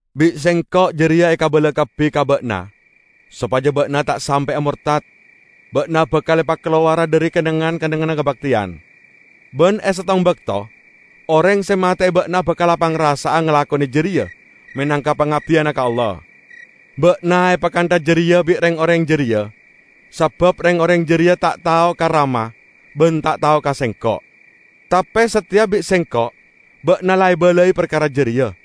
Bi' Sengko' jareya ekabala kabbi ka ba'na sopaja ba'na ta' sampe'a mortad. Ba'na bakal epakalowara dhari kennengngan-kennengnganna kabakteyan. Ban e settong bakto oreng se mate'e ba'na bakal apangrasa'a ngalakone jareya menangka pangabdiyanna ka Allah. Ba'na epakantha jareya bi' reng-oreng jareya sabab reng-oreng jareya ta' tao ka Rama ban ta' tao ka Sengko'. Tape sateya bi' Sengko' ba'na la ebalai parkara jareya,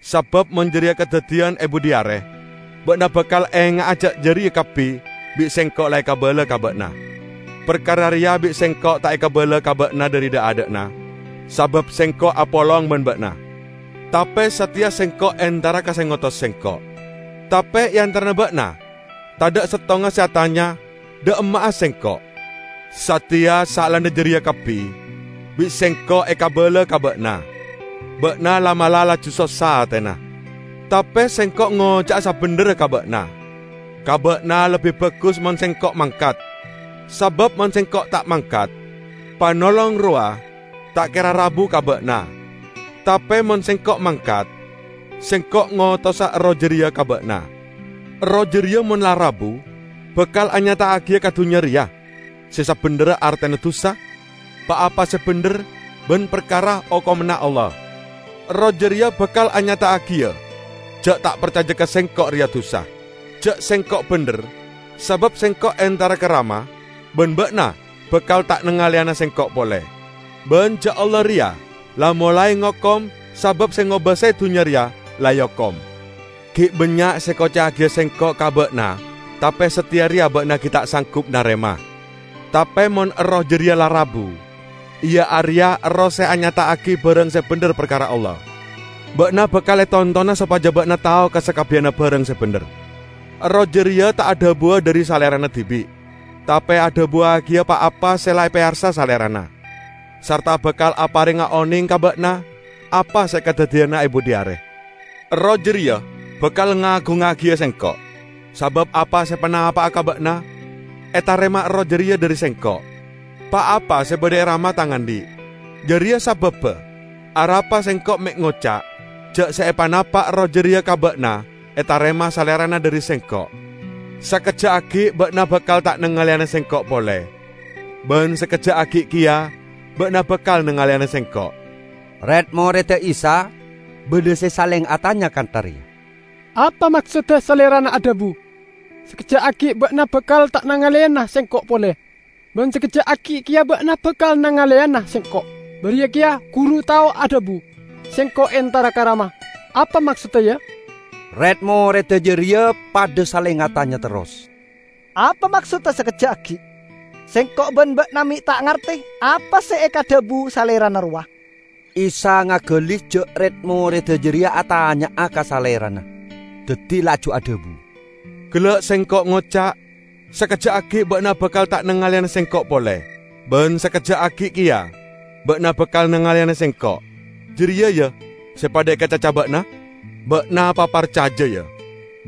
sabab mon jareya kadaddiyan e budhi are, ba'na bakal enga'a ja' jareya kabbi bi' Sengko' la ekabala ka ba'na." "Parkara reya bi' Sengko' ta' ekabala ka ba'na dhari dha'-adha'na sabab Sengko' apolong ban ba'na. Tape sateya Sengko' entara ka se ngotos Sengko'; tape e antarana ba'na tadha' settonga se atanya dha' emma'a Sengko'. Sateya saellana jareya kabbi bi' Sengko' ekabala ka ba'na, ba'na la'-mala' laju sossa atena. Tape Sengko' ngoca'a sabendherra ka ba'na: Ka ba'na lebbi bagus mon Sengko' mangkat; sabab mon Sengko' ta' mangkat, Panolong rowa ta' kera rabu ka ba'na. Tape mon Sengko' mangkat, Sengko' ngotosa Erroh jareya ka ba'na. Erroh jareya mon la rabu bakal anyata'agiya ka dunnya reya se sabendherra artena dusa, pa-apa se bendher, ban parkara okomanna Allah. Erroh jareya bakal anyata'agiya ja' ta' parcaja ka Sengko' reya dusa; ja' Sengko' bendher, sabab Sengko' entara ka Rama ban ba'na bakal ta' nangaleyana Sengko' pole; ban ja' Allah reya la molae ngokom sabab se ngobasae dunnya reya la eokom. Gi' bannya' se ekoca'agiya Sengko' ka ba'na tape sateya reya ba'na gi' ta' sanggup narema. Tape mon Erroh jareya la rabu, iya areya Erroh se anyata'agi barang se bendher parkara Allah, ba'na bakal etontona sopaja ba'na tao ka sakabbiyanna barang se bendher. Erroh jareya ta' adhabuwa dhari Salerana dibi' tape adhabuwagiya pa-apa se la epeyarsa Salerana, sarta bakal aparenga oneng ka ba'na apa se kadaddiyana e budhi are. Erroh jareya bakal ngagungngagiya Sengko', sabab apa se epanapa'a ka ba'na etarema Erroh jareya dhari Sengko'. Pa-apa se badha e Rama Tang andhi'. Jareya sababba arapa Sengko' me' ngoca' ja' se epanapa' Erroh jareya ka ba'na etarema Salerana dhari Sengko'." "Sakejja' aggi' ba'na bakal ta' nangaleyana Sengko' pole, ban sakejja' aggi' keya ba'na bakal nangaleyana Sengko'." Red-moredda Isa badha se saleng atanya kantha reya, "Apa maksodda Salerana adhabu, 'Sakejja' aggi' ba'na bakal ta' nangaleyana Sengko' pole, ban sakejja' aggi' keya ba'na bakal nangaleyana Sengko'?' Bariya keya Guru tao adhabu, 'Sengko' entara ka Rama.' Apa maksodda, ya?" Red-moredda jareya padha saleng atanya terros, "Apa maksodda 'sakejja' aggi'?' Sengko' ban ba'na me' ta' ngarte apa se ekadhabu Salerana rowa!" Isa ngagali ja' red-moredda jareya atanya'a ka Salerana, daddi laju adhabu, "Gella' Sengko' ngoca', 'Sakejja' aggi' ba'na bakal ta' nangaleyana Sengko' pole, ban sakejja' aggi' keya ba'na bakal nangaleyana Sengko'.' Jareya, ya, se padha ekacaca ba'na? Ba'na paparcaja, ya: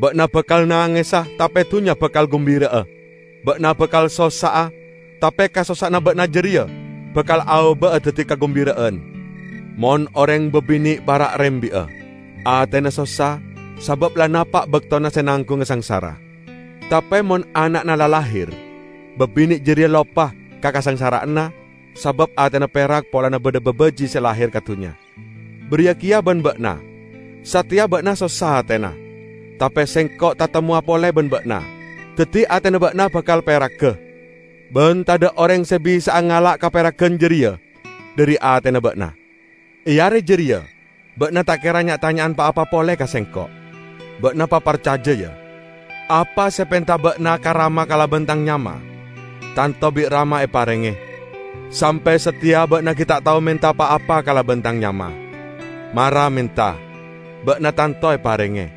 ba'na bakal nangesa tape dunnya bakal gumbira'a. Ba'na bakal sossa'a tape kasossa'anna ba'na jareya bakal aoba'a daddi kagumbira'an. Mon oreng babine' para' rembi'a, atena sossa, sabab la napa' baktona se nanggunga sangsara. Tape mon ana'na la lahir, babine' jareya loppa ka kasangsara'anna sabab atena perak polana badha babaji' se lahir ka dunnya. Bariya keya ban ba'na: Sateya ba'na sossa atena, tape Sengko' tatemmowa pole ban ba'na, daddi atena ba'na bakal peraga; ban tadha' oreng se bisa'a ngala' kaperagan jareya dhari atena ba'na. E are jareya ba'na ta' kera nya'-tanya'an pa-apa pole ka Sengko'. Ba'na paparcaja, ya: Apa se epenta ba'na ka Rama kalaban Tang nyama, tanto bi' Rama eparenge. Sampe' sateya ba'na gi' ta' tao menta pa-apa kalaban Tang nyama. Mara menta, ba'na tanto eparenge,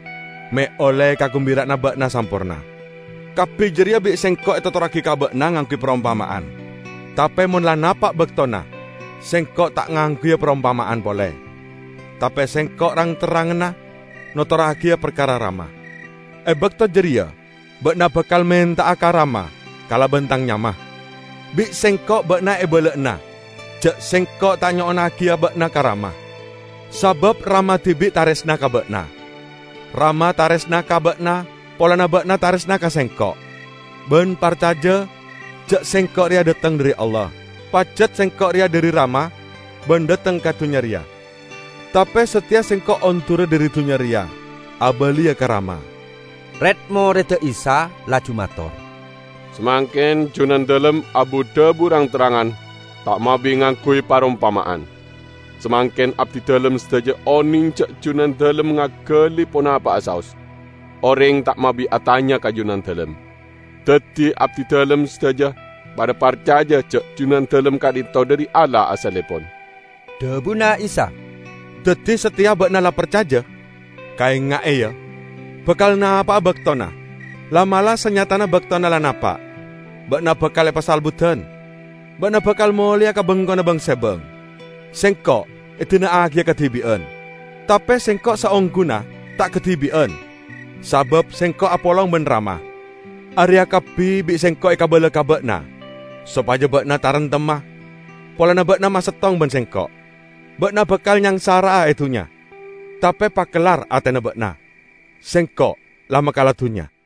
me' olle kagumbira'anna ba'na samporna." "Kabbi jareya bi' Sengko' etotorragi ka ba'na ngangguy parompama'an. Tape mon la napa' baktona Sengko' ta' ngangguya parompama'an pole, tape Sengko' rang-terrangana notorragiya parkara Rama. E bakto jareya ba'na bakal menta'a ka Rama kalaban Tang nyama; bi' Sengko' ba'na ebala'ana ja' Sengko' ta' nyo'onnagiya ba'na ka Rama, sabab Rama dibi' taresna ka ba'na. Rama taresna ka ba'na polana ba'na taresna ka Sengko', ban parcaja ja' Sengko' reya dhateng dhari Allah. Pajat Sengko' reya dhari Rama ban dhateng ka dunnya reya. Tape sateya Sengko' ondura dhari dunnya reya abaliya ka Rama." Red-moredda Isa laju mator, "Samangken Junandalem abu-dhabu rang-terrangan ta' mabi ngangguy parompama'an; samangken abdidalem sadaja oneng ja' Junandalem ngagali ponapa'a saos. Oreng ta' mabi atanya ka Junandalem. Daddi abdidalem sadaja padha parcaja ja' Junandalem ka'dhinto' dhari Allah asallepon." Dhabuna Isa, "Daddi sateya ba'na la parcaja? Kaenga'e, ya! Bakal napa'a baktona, la'-mala' sanyatana baktona la napa', ba'na bakal epasalebbudan. Ba'na bakal moleya ka bengkona bang-sebang, Sengko' edina'agiya kadibi'an. Tape Sengko' saongguna ta' kadibi'an sabab Sengko' apolong ban Rama. Areya kabbi bi' Sengko' ekabala ka ba'na sopaja ba'na taremtemma polana ba'na masettong ban Sengko'. Ba'na bakal nyangsara'a e dunnya. Tape pakellar atena ba'na! Sengko' la makala dunnya!"